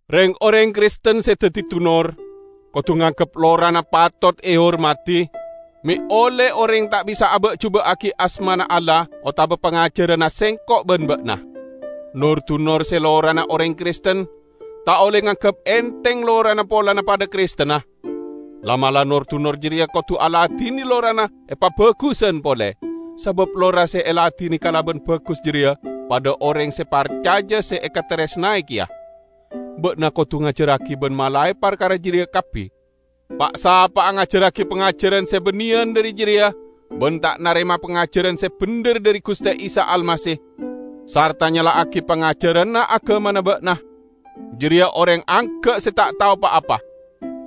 Reng-oreng Kristen se daddi dunor, kodu nganggep lorana patot ehormadi, me' olle oreng ta' bisa aba'-juba'agi asmana Allah otaba pangajaranna sengko' ban ba'na. Nor-dunor se lorana oreng Kristen, ta' olle nganggep entheng lorana polana padha Kristenna. La'-mala' nor-dunor jareya kodu aladine lorana epabagusan pole, sabab lora se eladine kalaban bagus jareya padha oreng se parcaja se ekataresnae keya. Ba'na kodu ngajarragi ban malae parkara jareya kabbi. Pa'-sapa'a ngajarragi pangajaran se banneyan dhari jareya ban ta' narema pangajaran se bendher dhari Guste Isa Almasih sarta nyala'agi pangajaranna agamana ba'na, jareya oreng angga' se ta' tao pa-apa.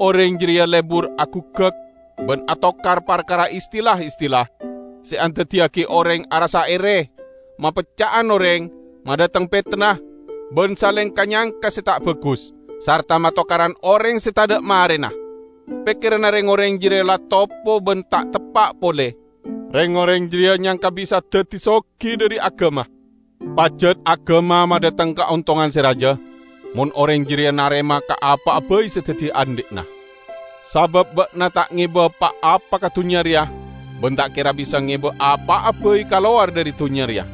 Oreng jareya lebur aguggak ban atokar parkara istilah-istilah, se andaddiyagi oreng arassa ere, mapecca'an oreng, madhateng petenna, ban saleng ka-nyangka se ta' bagus, sarta matokaran oreng se tadha' marena. Pekkeranna reng-oreng jareya la topo ban ta' teppa' pole. Reng-oreng jareya nyangka bisa daddi sogi dhari agama. Pajat agama madhateng kaontongan se raja, mon oreng jareya narema ka apa'a bai se daddi andhi'na. Sabab ba'na ta' ngeba pa-apa ka dunnya reya, ban ta' kera bisa ngeba apa'a bai kalowar dhari dunnya reya.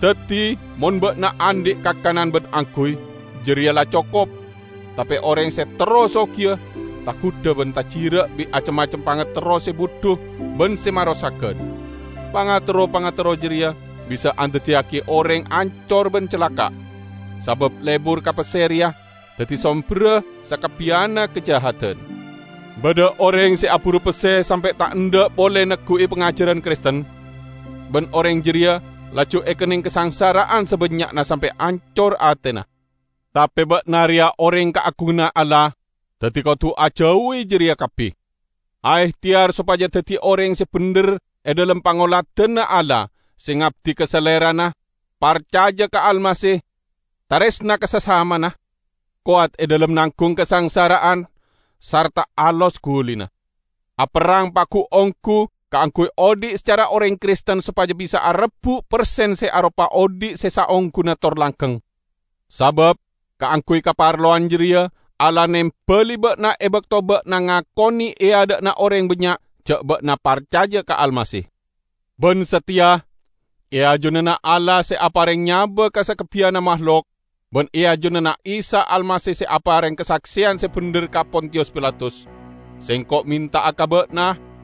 Daddi, mon ba'na andhi' kakanan ban angguy, jareya la cokop. Tape oreng se terro sogiya, tagudha ban tajira' bi' acem-macem pangaterro se budhu ban se marosagan. Pangaterro-pangaterro jareya bisa andaddiyagi oreng ancor ban calaka'. Sabab lebur ka pesse reya daddi somberra sakabbiyanna kajahadan. Badha oreng se aburu pesse sampe' ta' endha' pole neggu'i pangajaran Kristen, ban oreng jareya laju ekenneng kasangsara'an sabannya'na sampe' ancor atena. Tape ba'na reya oreng kaagunganna Allah, daddi kodu ajauwi jareya kabbi. Aehteyar sopaja daddi oreng se bendher e dhalem pangoladanna Allah, se ngabdi ka Salerana, parcaja ka Almasih, taresna ka sasamana, kowat e dhalem nanggung kasangsara'an, sarta alos gulina. Aperrang pagu-onggu kaangguy odhi' sacara oreng Kristen sopaja bisa arebbu' persen se aropa odhi' se saongguna tor langgeng. Sabab kaangguy kaparlowan jareya Allah nembali ba'na e bakto ba'na ngakone e adha'na oreng bannya' ja' ba'na parcaja ka Almasih. Ban sateya, e ajunanna Allah se apareng nyaba ka sakabbiyanna mahlok, ban e ajunanna Isa Almasih se apareng kasakseyan se bendher ka Pontiyus Pilatus, sengko' menta'a ka ba'na: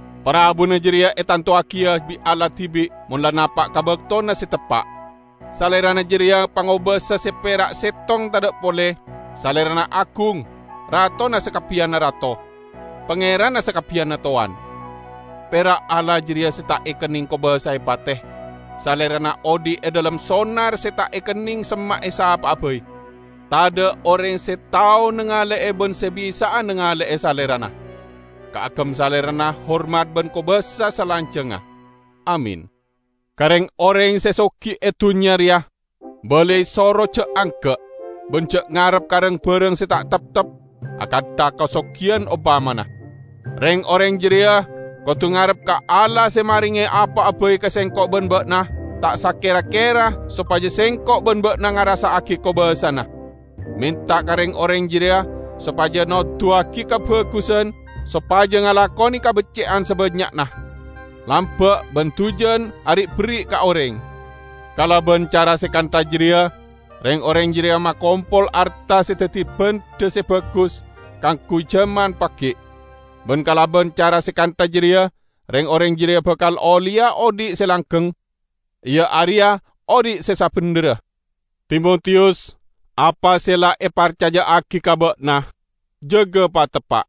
Parabuna jareya etantowagiya bi' Allah dibi' mon la napa' ka baktona se teppa'; Salerana jareya pangobasa se pera' settong tadha' pole; Salerana agung, Ratona sakabbiyanna rato, Pangeranna sakabbiyanna towan. Pera' Allah jareya se ta' ekenneng kobasae pate; Salerana odhi' e dhalem sonar se ta' ekenneng semma'e sapa'a bai. Tadha' oreng se tao nangale'e ban se bisa'a nangale'e Salerana. Kaagem Salerana hormat ban kobasa salanjangnga! Amin. Ka reng-oreng se sogi e dunnya reya balai soro ja' angga', ban ja' ngarep ka rang-barang se ta' teptep -- akantha kasogiyan ompamana. Reng-oreng jareya kodu ngarep ka Allah se marenge apa'a bai ka sengko' ban ba'na ta' sakera-kera sopaja sengko' ban ba'na ngarassa'agi kobassana. Menta ka reng-oreng jareya sopaja noduwagi kabagusan, sopaja ngalakone kabecce'an sabannya'na, lamba' ban dujan ari'-berri' ka oreng. Kalaban cara se kantha jareya reng-oreng jareya makompol arta se daddi bandha se bagus kaangguy jaman pagi'. Ban kalaban cara se kantha jareya reng-oreng jareya bakal olleya odhi' se langgeng, iya areya odhi' se sabendherra. Timotiyus, apa se la eparcaja'agi ka ba'na, jaga pateppa'!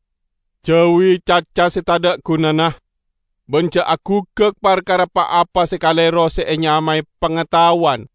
Jauwi caca se tadha' gunana, ban ja' aguggak parkara pa-apa se kalero se enyamae "Pangataowan".